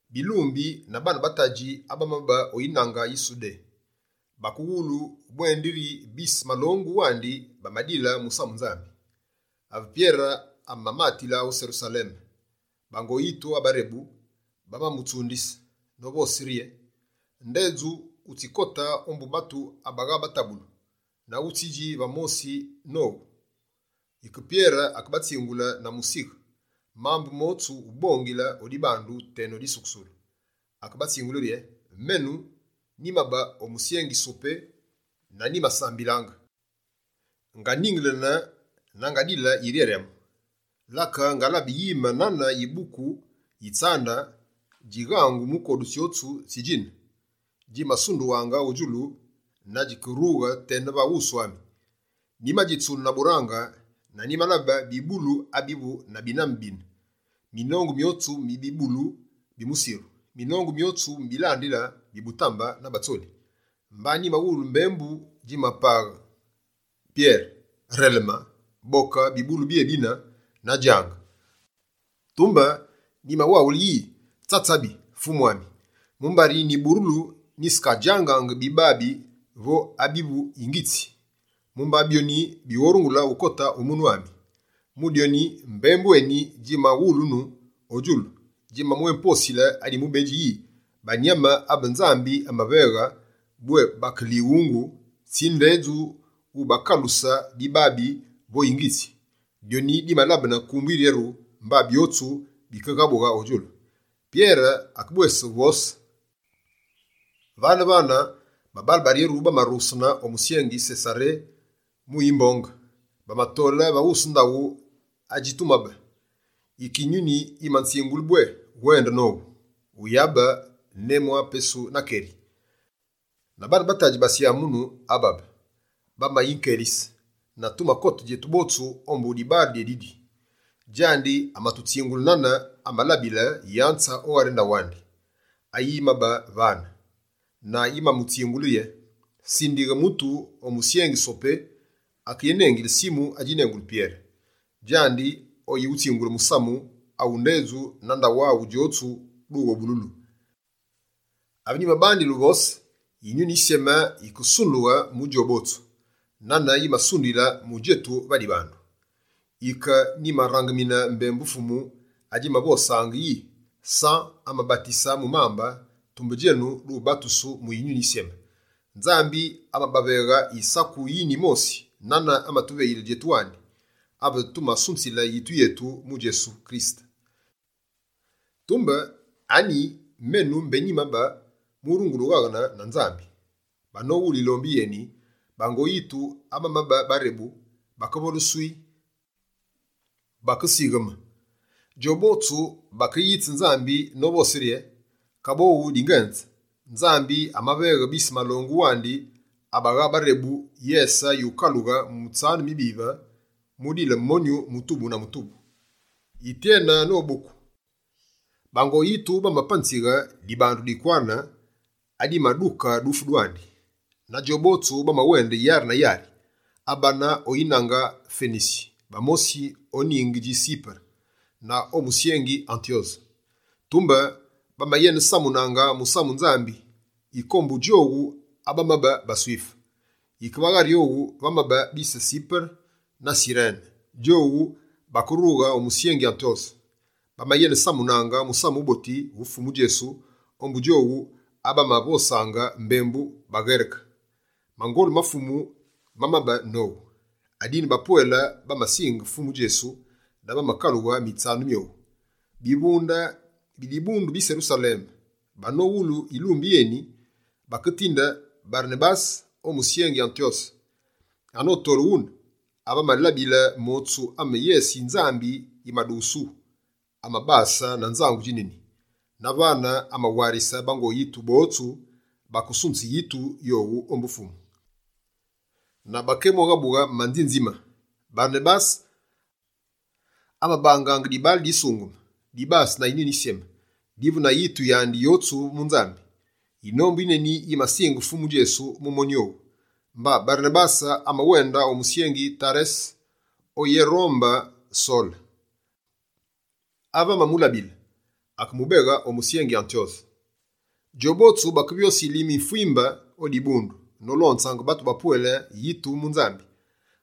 Bilumbi na baane ba tadji abamabe o yinange yi Sudé, bakewulu bwendiri bise malongu wandi bamadile musamu Nzambi. Ave Pyere amamatile o Serusaleme, bango yitu abarebu bamamutsundise novose rye: «Ndedju wutsikote ombu batu abagha batabulu, na wutsidji va mosi nowu!» Yike Pyere akebatsingule na musighe, mambu motsu, ubongile o dibandu teno disukusulu, akebatsingule rye: «Menu, nyimabe o musyengi Sopé na nyimasambililaange, nganingelene na ngadile yiryaryamu. Lake ngalabe yime nane yibuku yi tsande djineni, djighangu mu kodu tsyotsu tsi djine, djimasundughaange o djulu na djikerughe tena va wusu ami. Nyimadjitsune na burange na nyimalabe bibulu abivu na biname bina, minongu myotsu mi bibulu bi musiru, minongu myotsu mi bilandile bi butambe na batsoli. Mba nyimawulu dyufi dimapaghe yi: “Pyere, releme! Boke bibulu byébibi na djange!” Tumbe nyimawaghule yi: “Tsatsabi! Fumu ami, mumbari nyiburulu, nyisekadjangaange bibabi vo abivu yingitsi. Mumba byoni, bighorungule ukote o munu ami.” Mu dyoni, mbembu eni djimawulunu o djulu, djimabwéposile adi mubedji yi: “Abi Nzambi amalyomise, ndedju wuyabilabe nzoruru.” Dyoni dimalabene kumbu yiryeru, mba byotsu bikeghabughe o djulu.» Pyere akebwese uvose: «Vane-vane, babaale baryeru bamarughesene o musyengi Sesaré mu yimbonge, bamatole va wusu ndaghu adjitumabe. Yike, Yinyuni yimanzingule bwé wende nowu, wuyabe némwapesu na keri. Na baane ba tadji ba syamunu ababe, bamayinkelise, na tumakote djetu botsu ombu dibaale dyédidi. Djandi amatutsingule nane amalabile yanze o ghari ndaghu andi, ayi yimabe vane, na yimamutsingule yiri: “Sindighe mutu o musyengi Sopé, akéwunengilile Simu awu bénengili Pyere. Djandi oyiwutsingule musamu, awu ndedju na ndaghu aghu djotsu, dughobululu.” Ave nyimabandile uvose, Yinyuni Yisyeme yikesundughe mu djowu botsu, nane yimasunduyile mu djetu va dibandu. Yike nyimarangemine mbembu Fumu adjimavosaange yi: “San amabatise mu mambe, tumbe djenu, dubatusu mu Yinyuni Yisyeme.” Nzambi amabaveghe yisaku yine yimosi, nane amatuveyile djetu wandi, ave tumasunzile yitu yetu mu Fumu Djesu Kirisete. Tumbe anyi menu mbé nyimabe, murungule ughaghene na Nzambi?» Banowulu yilombi yeni, bango yitu abamabe barebu, bakevole «swii», bakesigheme. Djowu botsu bakeyitse Nzambi novose rye: «Kaboghu dingenze, Nzambi amaveghe bise malongu wandi abagha barebu, yese yukalughe mutsanu wubive, mu dile monyu mutubu na mutubu.» Yityene anoboku, bango yitu bamapanzighe dibandu dikwane, adimaduke dufu dwandi. Na djobotsu bamawende yari na yari: abane o yinange Fenisi, bamosi o ningi dji Sipere na o musyengi Antyose. Tumbe bamayenesamunaange musamu Nzambi, yike ombu djowu abamabe baSwife. Yike va ghari owu, vamabe bise Sipere na Sirene, djowu bakerughe o musyengi Antyose. Bamayenesamunaange Musamu Wuboti wu Fumu Djesu ombu djowu abamavosaange mbembu baNgereke. Mangolu ma Fumu mamabe nowu, adine bapwele bamasinge Fumu Djesu na bamakalughe mutsanu owu. Bivunde bi dibundu di Serusaleme banowulu yilumbi yeni, baketinde Barenabase o musyengi Antyose. Anotole wune, ave amalabile motsu ame yese yi Nzambi yimadughusu, amabase na nzangu djineni. Na vane, amawarise bango yitu botsu bakesunze yitu yowu mu Fumu, na bakébwéghabughe manzinzime. Barenabase amabangaange dibaale adisungeme, dibase na Yinyuni Yisyeme, divu na yitu yandi yotsu mu Nzambi. Yinombu yineni yimasinge Fumu Djesu mu monyu owu. Mba Barenabase amawende o musyengi Tarese oyérombe Sole. Ave amamulabile, akemubeghe o musyengi Antyose. Djobotsu bakevyose yilime yifwimbe o dibundu, nolonzaange batu bapwele yitu mu Nzambi.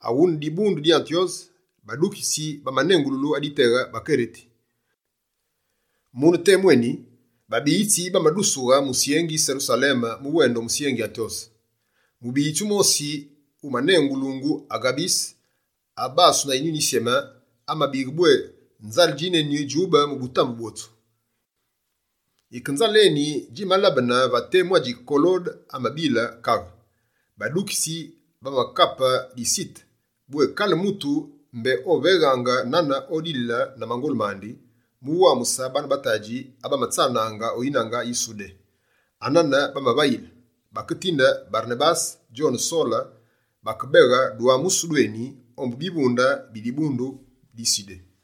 Aghune dibundu di Antyose, badukitsi bamanengululu aditeghe: «Bakereti». Mune temu eni, babiyitsi bamadusughe musyengi Serusaleme mu wende o musyengi Antyose. Mubiyitsi wumosi wumanengulu Aghabise, abasu na Yinyuni Yisyeme, amabighe bwé nzale djineni djube mu butambe bwotsu. Yike nzale eni djimalabene va temu adji Kolode amabile kaghe. Badukitsi bamakape disite, bwé kale mutu mbé oveghaange nane odilile na mangolu mandi, mu wamuse baane ba tadji abamatsanaange o yinange yi Sudé. Anane bamavayile. Baketinde Barenabase djone Sole bakebeghe dwamusu dweni, ombu bivunde bi dibundu di Sudé.